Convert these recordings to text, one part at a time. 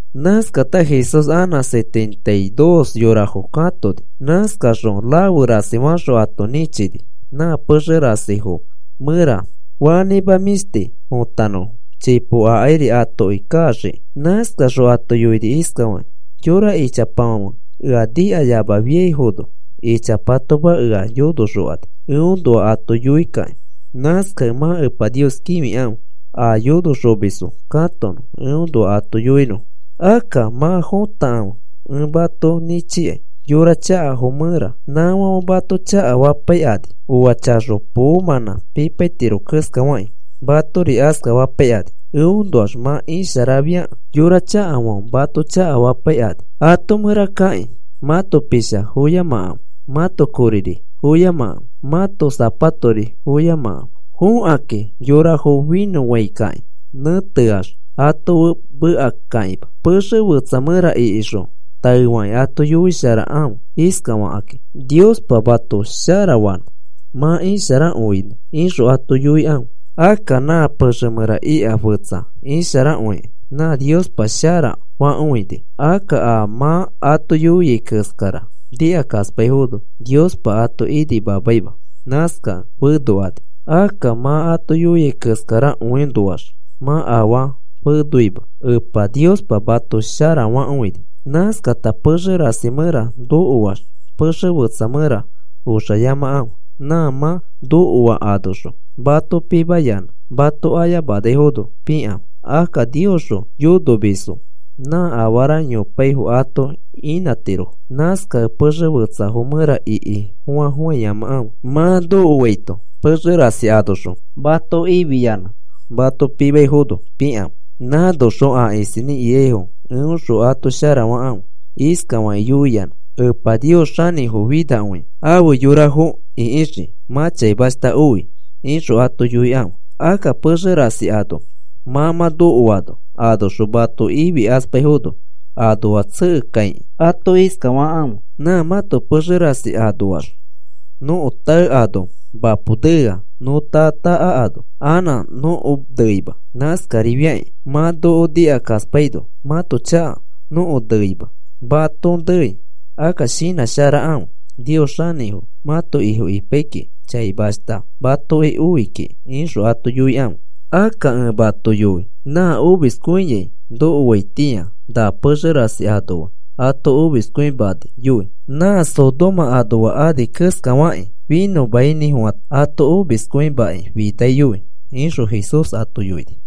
Nãskata Jesús anã setenta y dos yorafo katoni. Nãskaxõ rafe rasi faxõ ato nĩchini nã pexe rasifo mẽra fanĩma mĩshti fotanõfo chipo akairi atoki kaxiki. Nãskaxõ ato yoini iskafakĩ: “Yora ichapafãfe ea nikayamafiaifono ichapatoma ea yonoxokani eõnoa ato yoikakĩ. Nãskakẽ mã Epa Nios kĩfikãfe a yonoxomisfo katonõ eõnoa ato yoinõfo. Akka mã fotakãfe, ẽ mato nĩchikai yora chakafo mẽra nãfãfe mato chakafapaikani. Oa chaxo poomãnã pipaitiro keskafakĩ, matori askafapaikani eõnoax mã isharafiakẽ yora chakafãfe mato chakafapaikani. Ato mẽra kakĩ mãto forosa foyamakãfe, mãto koriri foyamakãfe, mãto sapatori foyamakãfe. Fokãkĩ yorafo finõfãikakĩ nẽteax ato fe mekakakĩma. Pexe fetsa mẽra ikixõ taefakĩ ato yoisharakãfe iskafakĩ: ‘Niospa mato sharafanõ mã isharakõinõ,’ ixõ ato yoikãfe. Akka nã pexe mẽra ika fetsa isharakõikẽ nã Niospa shara fakõini. Akka a mã ato yoiai keskara nikakaspaifono Niospa ato inimamaima. Nãskakẽ fenokani. Akka mã ato yoiai keskarakõinoax mã afaa fenoima. Epa Niospa mato sharafakõini. Nãskata pexe rasi mẽra nokoax pexe fetsa mẽra oxayamakãfe. Nã mã nokoa anoxõ mato pimayanã mato ayamanaifono pikãfe. Akka Niosxõ yonomisfo nã afara yopaifo ato inãtirofo. Nãskakẽ pexe fetsafo mẽra iki foa foayamakãfe. Mã nokoaito pexe rasi anoxõ mato ifiyanã mato pimaifono pikãfe. Nãnoxõ a isinĩ ikaifo eõxõ ato sharafakãfe, iskafakĩ yoiyanã: ‘Epa Nios xanĩfo finakõi afe yorafo ĩkixikĩ mã chaimashta oi,’ ixõ ato yoikãfe. Akka pexe rasi ano mã mã nokoano anoxõ mato ifikaspaifono, anoax tsekekãikĩ ato iskafakãfe: ‘Nã mãto pexe rasi anoax nõko tae ano mapo neano, nõ taa taa akano anã nõko neima. Nãskarifiakĩ mã noko nikakaspaino mãto chaka nõko neima, mãto nei. Akka shinãsharakãfe Nios xanĩfo mãto Ifo ipai mã chaimashta matoki oi kiki,’ ixõ ato yoikãfe. Akka ẽ mato yoi, nã omiskõiai nokoaitĩa, na pexe rasi anoa ato omiskõimaniyoi nã Sodoma anoafo ani keskafakĩ finõmainĩfofã ato omiskõimakĩ finakõiyoi,” ixõ Jesús ato yoini.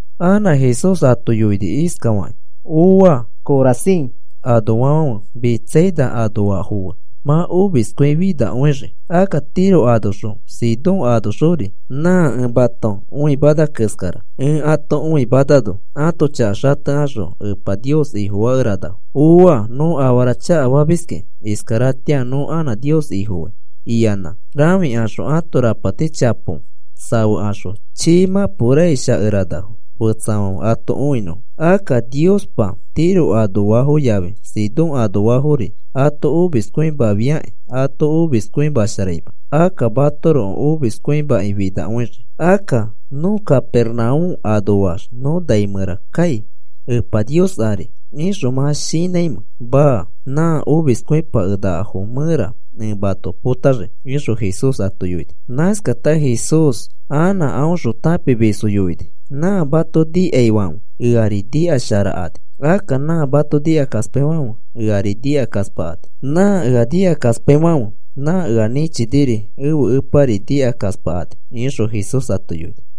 Anã Jesús ato yoini iskafakĩ: “¡Ooa! Corazin anoafãfe Betsaida anoafo fe mã omiskõifinakõixii. Akka Tiro anoxõ Sidón anoxori nã ẽ mato õimana keskara, ẽ ato õimanano ãto chaka xatekaxõ Epa Nios Ifofakeranafo. ‘¡Ooa! Nõ afara chakafamiskĩ iskaratĩa nõ anã Nios Ifofai,’ iyanã rãfikaxõ ãto rapati chapo safekaxõ chii mãpo raish akeranafo fetsafãfe ato õinõfo. Akka Niospa Tiro anoafo yafi Sidón anoafori ato omiskõimafiakĩ ato omiskõimasharaima, akka matoroko omiskõimakĩ finakõixii. Akka, ¿nõ Capernaúm anoax nõ nai mẽra kai Epa Nios ari ixõ mã shinãimẽ? Maa. Nã omiskõipakenakafo mẽra ẽ mato potaxii,” ixõ Jesús ato yoini. Nãskata Jesús anã aõxõ tãpimisfo yoini: “Nã mato nikaifãfe, eari nikasharakani. Akka nã mato nikakaspaifãfe, eari nikakaspakani. Nã ea nikakaspaifãfe nã ea nĩchiniri ẽfe Epari nikakaspakani,” ixõ Jesús ato yoini.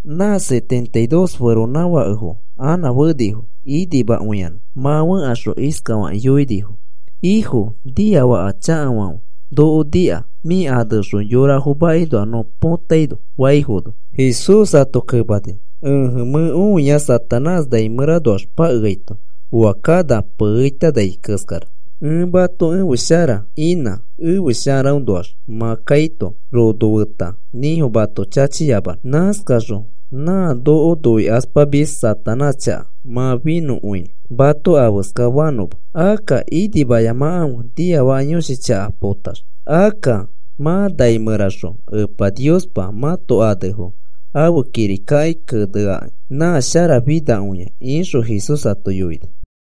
Nã setenta y dos feronãfakefo anã fenifo, inimakõiyanã. Mã fẽkaxõ iskafakĩ yoinifo: “Ifo, niafaka chakafãfe noko nika mĩ aneõxõ yorafo makinoa nõ potaino,” faifono, Jesús ato kemani: “Ẽje, mẽ õia Satanás nai mẽranoax pakeaito oa kana piishikai keskara. Ẽ mato ẽfe shara inã, ẽfe sharaõnoax mã kaito rono feta nĩfo mato chachiyamanõ. Nãskaxõ nã noko noikaspamis Satanás chaka mã finõkõinõ, mato afeskafanõma. Akka inimayamakãfe niafaka yõshi chaka potax. Akka mã nai mẽraxõ Epa Niospa mãto anefo ãfe kirikaki keneaki, nã sharafinakõia,” ixõ Jesús ato yoini.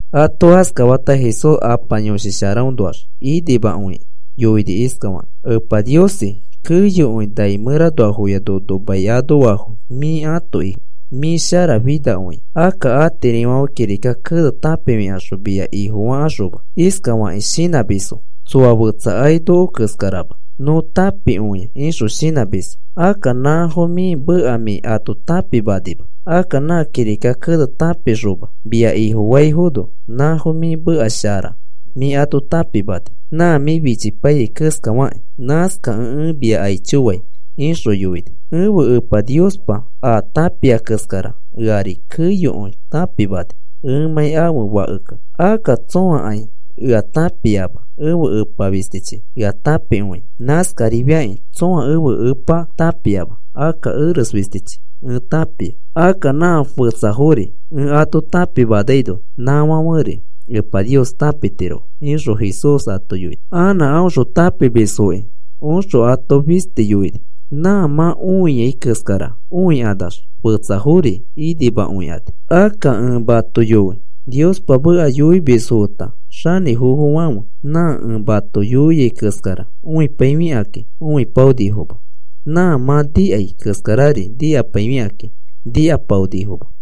Ato askafata, Jesús Apa Yõshi Sharaõnoax inimakõikĩ yoini iskafakĩ: “Epa Niosi, keyokõi nai mẽranoafoya nono mai anoafo mĩ ãto Ifo. Mĩ sharafinakõia. Akka atirifãfe kirika kene tãpifikaxõ mia Ifo fakaxoma. Iskafakĩ shinãmisfo: ‘Tsoa fetsakai noko keskarama, nõ tãpikõia,’ ixõ shinãmisfo. Akka nãfo mĩ meka mĩ ato tãpimanima. Akka nã kirika kene tãpikaxoma mia Ifofaifono nãfo mĩ meka shara mĩ ato tãpimani, nã mĩ fichipaiyai keskafakĩ. Nãskakẽ ẽ mia aicho fai,” ixõ yoini. “Ẽfe Epa Niospa a tãpia keskara eari keyokõi tãpimani ẽmãi ãfe Fakekẽ. Akka tsõakai ea tãpiama, ẽfe Epa fistichi ea tãpikõia. Nãskarifiakĩ tsõa ẽfe Epa tãpiama, akka eres fisti ẽ tãpia. Akka nã fetsafori ẽ ato tãpimanaino nãfãferi Epa Nios tãpitirofo,” ixõ Jesús ato yoini. Anã aõxõ tãpimisfoki oxõ ato fisti yoini: “Nã mã õiai keskara õikanax fetsafori inimakõikani. Akka ẽ mato yoi, Niospa meka yoimisfo feta xanĩfofofãfe nã ẽ mato yoiai keskara õipaifikakĩ õipaonifoma. Nã mã nikai keskarari nikapaifikakĩ nikapaonifoma.”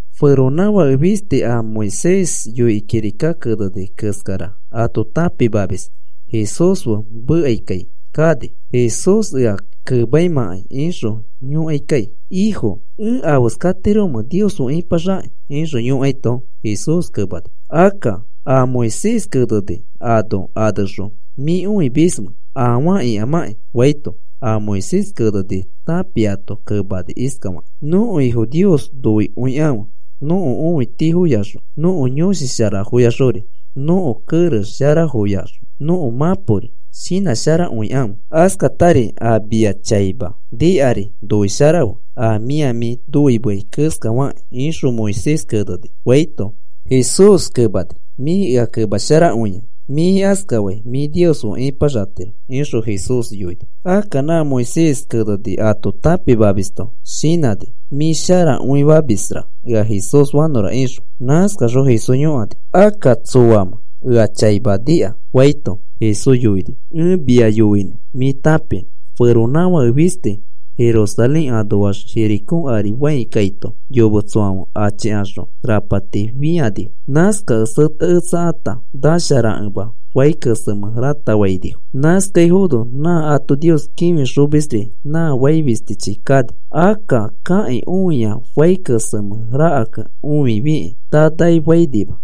Feronãfake fisti a Moisés yoikĩ kirika keneni keskara ato tãpimamis Jesús fe mekaikai kani. Jesús ea kemaimãkai ixõ yõkaikai: “Ifo, ¿ẽ afeskatiromẽ Nios fe ĩpaxakĩ?” ixõ yõkaito, Jesús kemani: “Akka, ¿a Moisés keneni ano anexõ mĩ õimismamẽ afaa ikamãkĩ?” faito, a Moisés keneni tãpiato kemani iskafaki: “Nõko Ifo Nios noikõikãfe nõko õitifoyaxõ nõko yõshi sharafoyaxori nõko kerex sharafoyaxõ nõko mãpori shinãsharakõikãfe, askatari a mia chaima nikari noisharafe a mĩa mĩ noimeai keskafakĩ ixõ Moisés keneni,” faito, Jesús kemani: “Mĩ ea kemasharakõia, mĩ askafai mĩ Nios fe ĩpaxatiro,” ixõ Jesús yoini. Akka nã Moisés keneni ato tãpimamisto shinãni, mĩ isharakõimisra ea Jesús fanõra ixõ. Nãskaxõ Jesús yõkani: “Akka, ¿tsoamẽ ea chaima nika?” faito, Jesús yoini: “Ẽ mia yoinõ mĩ tãpinõ. Feronãfake fisti Jerusalén anoax Jericó ari fãi kaito, yometsofãfe achikaxõ rapati fĩanifo. Nãskakẽ seteketsakata nasharakẽma fai kesemẽ rãtafainifo. Nãskano nã ato Nios kĩfixomisri nã fai fistichi kani. Akka kakĩ õia fai kesemẽ rakakẽ õifikĩ tanafainima.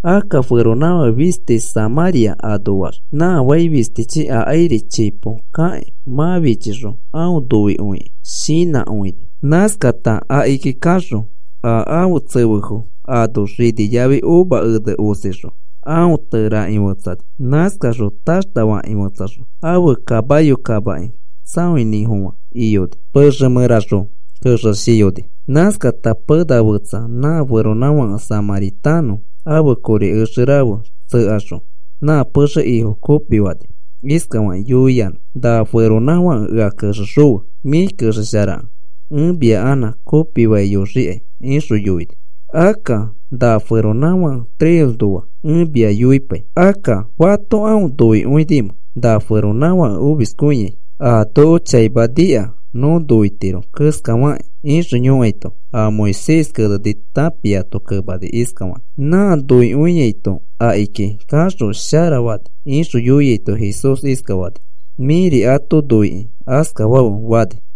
Akka feronãfake fisti Samãria anoax nã fai fistichi akairi chipo kakĩ, mã fichixõ aõ noikõikĩ shinãkõini. Nãskata akiki kaxõ, a ãfe tsefefo ano xini yafi uva ene osixõ aõ tereaki fetsani. Nãskaxõ taxta fakĩ fetsaxõ, ãfe kamayo kamaki tsaoinĩfofã iyoni, pexe mẽraxõ kexeshiyoni. Nãskata pena fetsa nã feronãfake samãritanõ ãfe kori exe rafe tsekaxõ nã pexe ifo kopifani iskafakĩ yoiyanã: ‘Na feronãfake ea kexexõfe. Mĩ kexesharakẽ ẽ mia anã kopifaiyoxikai,’ ixõ yoini. Akka na feronãfake tresnoa ẽ mia yoipai. Akka, ¿fato aõ noikõinimẽ na feronãfake omiskõiai, a noko chaima nika nõ noitiro keskafakĩ?” ixõ yoikaito, a Moisés keneni tãpiato kemani iskafakĩ: “Nã noikõiaito akiki kaxõ sharafani,” ixõ yoiaito, Jesús iskafani: “Mĩri ato noikĩ askafafe,” fani.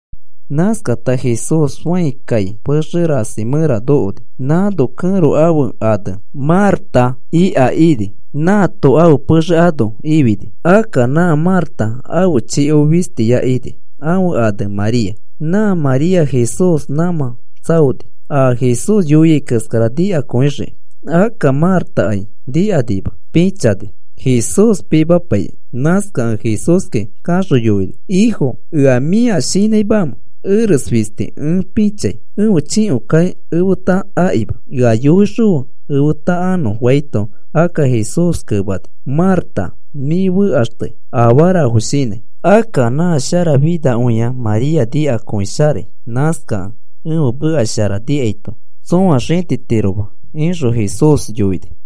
Nãskata Jesús fãi kai pexe rasi mẽra nokoni, nãno kẽro ãfe ane Marta ika ini nãato ãfe pexe ano ifini. Akka nã Marta ãfe chiko fistiya ini, ãfe ane María. Nã María Jesús nãmã tsaoni a Jesús yoiai keskara nikakõixikĩ. Akka Martakai nikanima. Pĩchani Jesús pimapaikĩ. Nãskakẽ Jesúski kaxõ yoini: “Ifo, ¿ea mĩa shinãimamẽ eres fisti ẽ pĩchai ẽfe chikokai efeta akima? Ea yoixõfe efeta anõ,” faito, akka Jesús kemani: “Marta, mĩ fekaxtei afarafo shinãi. Akka nã sharafinakõia María nikakõisharai. Nãskakẽ ẽfe meka shara nikaito tsõa xĩtitiroma,” ixõ Jesús yoini.